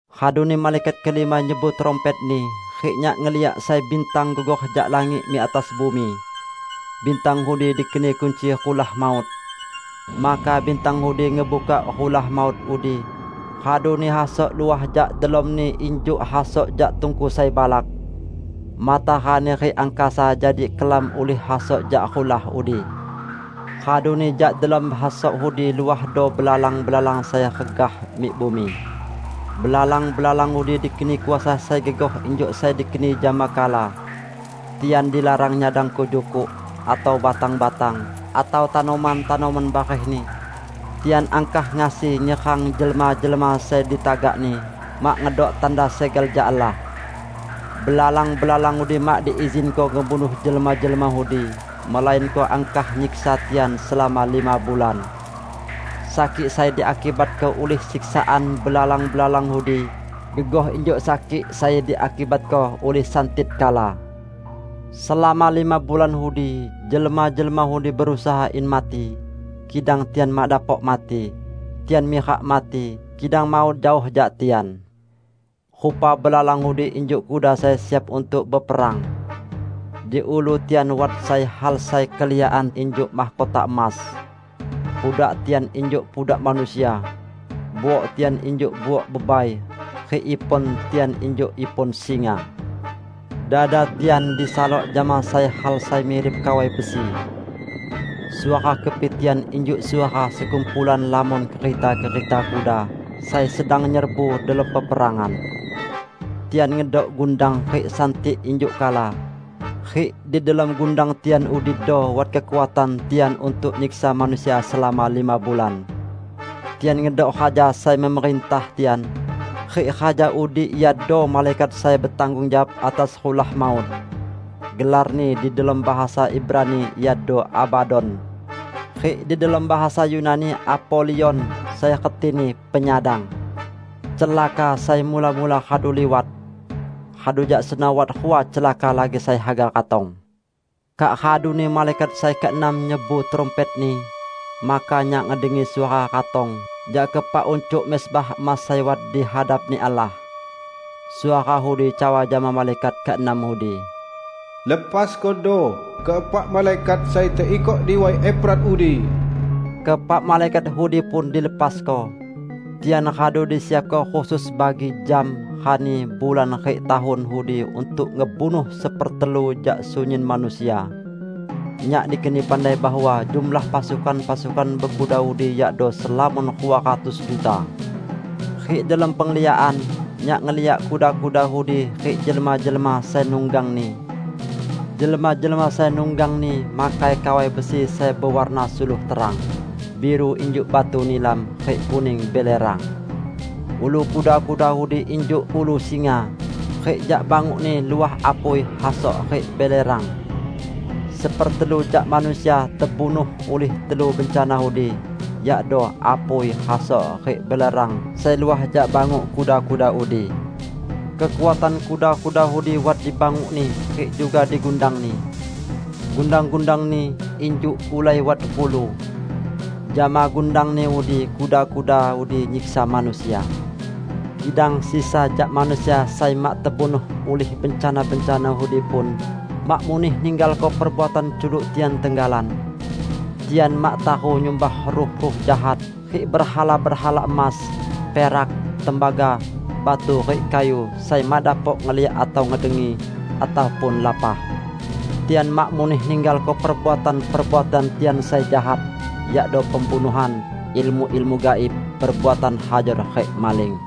Raduni malaikat kelima nyebu trumpetni, rik nyak ngeliak sai bintang gugor jak langit mik atas bumi. Bintang udi dikeni kunci rulah maut. Maka bintang udi ngebukak rulah maut udi, raduni hasok luah jak delomni injuk hasok jak tungku sai balak. Matarani rik angkasa jadi kelam ulih hasok jak rulah udi. Raduni jak delom hasok udi luahdo belalang-belalang sai regah mik bumi. Belalang-belalang udi dikeni kuasa sai gegoh injuk sai dikeni jama kala. Tian dilarang nyadangko jukuk, atau batang-batang, atau tanoman-tanoman barehni. Tian angkah ngasi nyerang jelma-jelma sai ditagakni mak ngedok tanda segel jak Allah. Belalang-belalang udi mak diizinko ngebunuh jelma-jelma udi, melainko angkah nyiksa tian selama lima bulan. Sakik sai diakibatko ulih siksaan belalang-belalang udi gegoh injuk sakik sai diakibatko ulih santit kala. Selama lima bulan udi, jelma-jelma udi berusaha in mati, kidang tian mak dapok mati; tian mirak mati, kidang maut jaoh jak tian. Rupa belalang udi injuk kuda sai siap untuk beperang. Di ulu tian wat sai hal sai keliakan injuk mahkota emas. Pudak tian injuk pudak manusia. Buok tian injuk buok bebai, rik ipon tian injuk ipon singa. Dada tian disalok jama sai hal sai mirip kawai besi. Suara kepi tian injuk suara sekumpulan lamon kereta-kereta kuda sai sedang nyerbu delom peperangan. Tian ngedok gundang rik santit injuk kala. Rik di delom gundang tian udido wat kekuatan tian untuk nyiksa manusia selama lima bulan. Tian ngedok raja sai memerintah tian, rik raja udi iado malaikat sai betanggung jawab atas rulah maut. Gelarni di delom bahasa Ibrani iado Abadon; rik di delom bahasa Yunani Apolion (sai retini "Penyadang"). Celaka sai mula-mula radu liwat. Radu jak seno wat rua celaka lagi sai haga ratong. Kak raduni malaikat sai keenam nyebu trumpetni. Maka nyak ngedengi suara ratong jak keepak uncuk mezbah emas sai wat di hadap-Ni Allah. Suara udi cawa jama malaikat keenam udi, "Lepaskodo keepak malaikat sai teikok di Way Efrat udi!" Keepak malaikat udi pun dilepasko. Tian radu disiapko khusus bagi jam, rani, bulan rik tahun udi untuk ngebunuh sepertelu jak sunyin manusia. Nyak dikeni pandai bahwa jumlah pasukan-pasukan bekuda udi yakdo selamon rua ratus juta. Rik delom pengliakan, nyak ngeliak kuda-kuda udi rik jelma-jelma sai nunggangni. Jelma-jelma sai nunggangni makai kawai besi sai bewarna suluh terang, biru injuk batu nilam, rik kuning belerang. Ulu kuda-kuda udi injuk ulu singa, rik jak bangukni luah apui, hasok, rik belerang. Sepertelu jak manusia tebunuh ulih telu bencana udi; yakdo apui, hasok, rik belerang sai luah jak banguk kuda-kuda udi. Kekuatan kuda-kuda udi wat dibangukni rik juga di gundangni. Gundang-gundangni injuk ulai wat ulu. Jama gundangni udi, kuda-kuda udi nyiksa manusia. Kidang sisa jak manusia sai mak tebunuh ulih bencana-bencana udi pun, mak muneh ninggalko perbuatan culuk tian tenggalan. Tian mak taru nyumbah ruh-ruh jahat rik berhala-berhala emas, perak, tembaga, batu rik kayu sai mak dapok ngeliak atau ngedengi, ataupun lapah. Tian mak muneh ninggalko perbuatan-perbuatan tian sai jahat, yakdo pembunuhan, ilmu-ilmu gaib, perbuatan hajor rik maling.